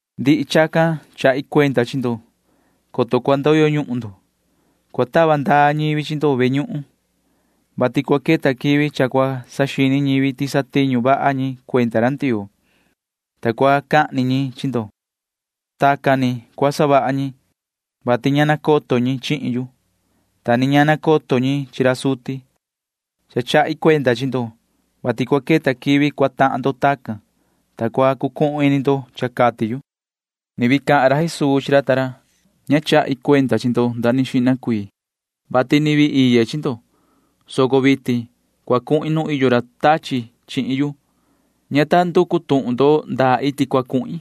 ’Ndihi chacan chahi cuenda chi ndo, coto cua ndoyo ñuhun ndo. Cua tava ndaa ñivi chi ndo ve ñuhun, vati cua queta quivi cha cua saxini ñivi ti satiñu vaha ñi cuenda ra Ndioo, ta cua cahni ñi chi ndo. Tacan ni cua savaha ñi, vati ña nacoto ñi chihin yu, ta ni ña nacoto ñi chi ra suti. Cha chahi cuenda chi ndo, vati cua queta quivi cua tahan ndo tacan, ta cua cucuhun ini ndo cha cati yu. Tiñu cua savaha ra Tati Ndioo [Ni vii cahan ra Jesuu chi ra ta ra:] ’Ña chahi cuenda chi ndo nda ni xihna cuii, vati ni vii iye chi ndo, soco vitin cua cuhin nu iyo ra tachi chihin yu. Ña ta nducu tuhun ndo ndaa iti cua cuhin,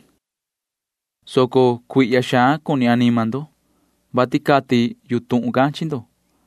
soco cuihya xaan cuni anima ndo, vati cati yu tuhun can chi ndo.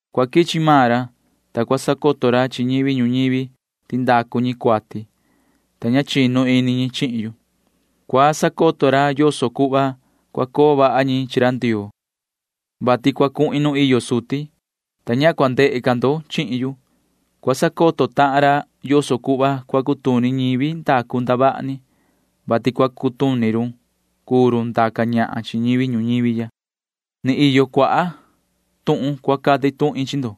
Cua quichi maan ra, ta cua sacoto ra chi ñivi ñuñivi ti ndacu ñi cuati, ta ña chinu ini ñi chihin yu. Cua sacoto ra yoso cuhva cua coo vaha ñi chi ra Ndioo, vati cua cuhin nu iyo suti, ta ña cua ndehe ca ndo chihin yu. Cua sacoto tahan ra yoso cuhva cua cutuni ñivi ndacu ndavaha ni, vati cua cutuni run cuu run ndaca ñahan chi ñivi ñuñivi ya. ’Ni iyo cuaha tuhun cua cati tuhin chi ndo,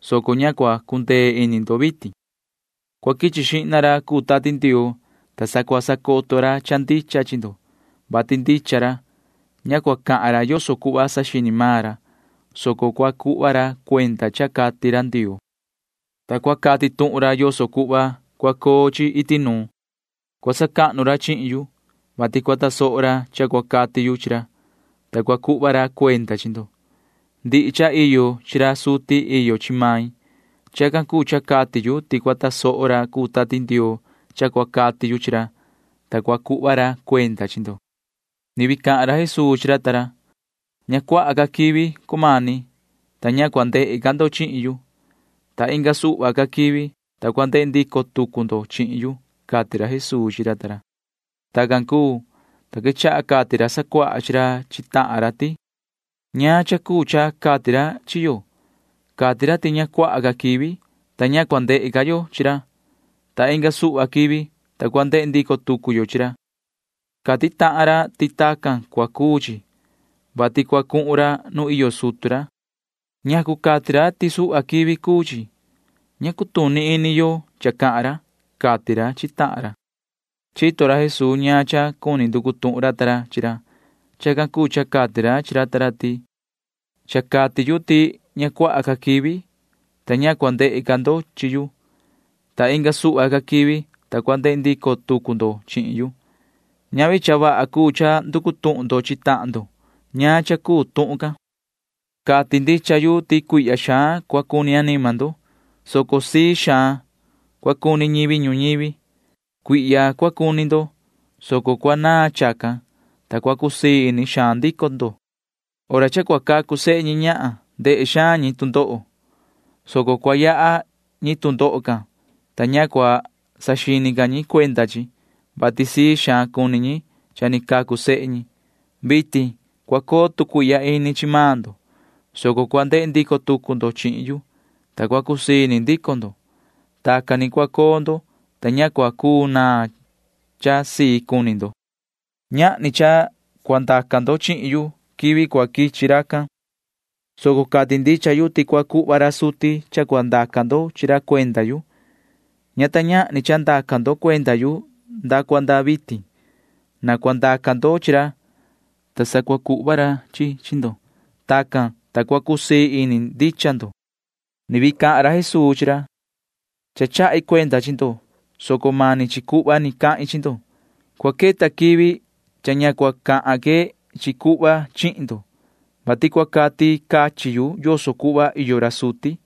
soco ña cua cundee ini ndo vitin. Cua quichi xihna ra cuu Tati Ndioo, ta sa cua sacoto ra cha ndicha chi ndo, vati ndicha ra. Ña cua cahan ra yoso cuhva saxini maan ra, soco cua cuhva ra cuenda cha cati ra Ndioo, ta cua cati tuhun ra yoso cuhva cua coo chi iti nuun. Cua sacahnu ra chihin yu, vati cua tasoho ra cha cua cati yu chi ra, ta cua cuhva ra cuenda chi ndo. Ndihi cha iyo chi ra suti iyo chi main. Chacan cuu cha cati yu ti cua tasoho ra cuu Tati Ndioo cha cua cati yu chi ra, ta cua cuhva ra cuenda chi ndo. [Ni vii cahan ra Jesuu chi ra ta ra:] ’Suhva quivi, ta ña cua ndehe ca ndo chihin yu, ta inga suhva ca quivi, ta cua ndehe ndico tucu ndo chihin yu ―cati ra Jesuu chi ra ta ra. Tacan cuu, ta quechaha cati ra sacuaha chi ra chi tahan ra ti: ―¿Ñaan cha cuu cha cati ra chi yo? Cati ra ti suhva quivi, ta ña cua ndehe ca yo chi ra, ta inga suhva quivi, ta cua ndehe ndico tucu yo chi ra. Cati tahan ra ti tacan cua cuu chi, vati cua cuhun ra nu iyo sutu ra. ¿Ñacu cati ra ti suhva quivi cuu chi? Ña cutuni ini yo cha cahan ra ―cati ra chi tahan ra. Chito ra Jesuu ñaan cha cuni nducu tuhun ra ta ra chi ra. Chacan cuu cha cati ra chi ra ta ra ti: ―Cha cati yu ti suhva quivi, ta ña cua ndehe ca ndo chihin yu, ta inga suhva quivi, ta cua ndehe ndico tucu ndo chihin yu. [Ñavi cha vaha cuu cha nducu tuhun ndo chi tahan ndo ñaan cha cuu tuhun can.] Cati ndicha yu ti cuihya xaan cua cuni anima ndo, soco sii xaan cua cuni ñivi ñuñivi. Cuihya cua cuni ndo, soco cua naan chacan, ta cua cusii ini xaan ndico ndo. Nu cuni cacu sehe ñi ñahan, ta cua tuvi ini ñi tu ndoho hora can, soco cua yaha ñi tu ndoho can, ta ña cua saxini ca ñi ti cha ni tuvi ini ñi tu ndoho, vati sii xaan cuni ñi cha ni cacu sehe ñi. Vitin cua coo tu cuihya ini chi maan ndo, soco cua ndehe ndico tucu ndo chihin yu, ta cua cusii ini ndico ndo. Tacan ni cua coo ndo, ta ña cua cuu naan cha sii cuni ndo. ’Ñahni cha cua ndaca ndo chihin yu quivi cua quichi racan, soco cati ndicha yu ti cua cuhva ra suti ñaan cha cuu cha cua ndaca ndo chi ra cuenda yu. Ña ta ñahni cha ndaca ndo cuenda yu nda cua nda vitin. Na cua ndaca ndo chi ra, ta sa cua cuhva ra chi chi chi ndo. Tacan, ta cua cusii ini ndicha ndo. [Ni vii cahan ra Jesuu chi ra:] ’Cha chahi cuenda chi ndo, soco mani chi cuhva ni cahin chi ndo. Cua queta quivi, ta ña cua cahan que chi ndo chi cuhva, vati cua cati cachin yu yoso cuhva iyo ra suti.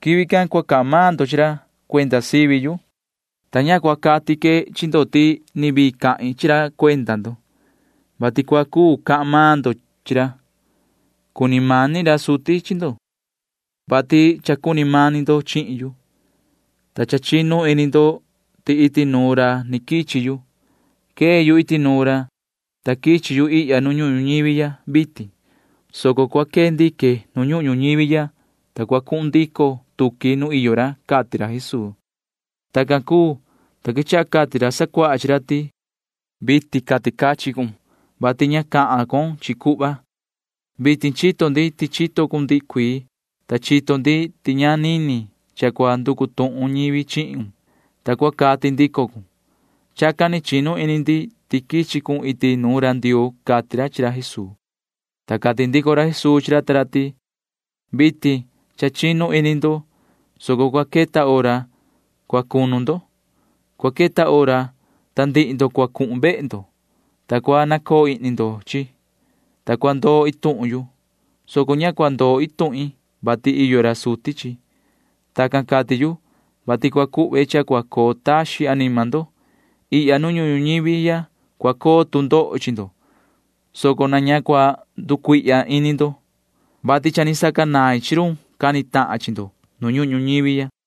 Quivi can sa cua cahan maan ndo chi ra cuenda sivi yu, ta ña cua cati que chi ndo ti ni vii cahin chi ra cuenda ndo, vati cua cuu cahan maan ndo chi ra. Cuni mani ra suti chi ndo, vati cha cuni mani ndo chihin yu, ta cha chinu ini ndo ti iti nuun ra ni quichi yu. Quee yu iti nuun ra, ta quichi yu ihya nu ñuhun ñuñivi ya vitin, soco cua quee ndique nu ñuhun ñuñivi ya, ta cua cuhun ndico tuqui nu iyo ra ―cati ra Jesuu. Tacan cuu, ta quechaha cati ra sacuaha chi ra ti: ―Vitin cati cachin cun, vati ña cahan con chi cuhva. Vitin chito ndi ti chito cun ndihi cuii, ta chito ndi ti ña nini cha cua nducu tuhun ñivi chihun, [ta cua cati ndico cun]. Chacan ni chinu ini ndi ti quichi cun iti nuun ra Ndioo ―cati ra chi ra Jesuu. Ta cati ndico ra Jesuu chi ra ta ra ti: ―Vitin cha chinu ini ndo, soco cua queta hora cua cunu ndo. Cua queta hora can, ta ndihi ndo cua cuhun ndo vehe ndo, ta cua nacoo ihni ndo chihin yu, ta cua ndoo iin tuhun yu, soco ña cua ndoi cha maan iin tuhin, vati iyo ra suti chihin yu. Tacan cati yu, vati cua cuhve cha cua coo taxin anima ndo. Ihya nu ñuhun ñuñivi ya cua coo tu ndoho chi ndo, soco na ña cua cucuihya ini ndo, vati cha ni sacanain chi run cua cani tahan chi ndo nu ñuhun ñuñivi ya.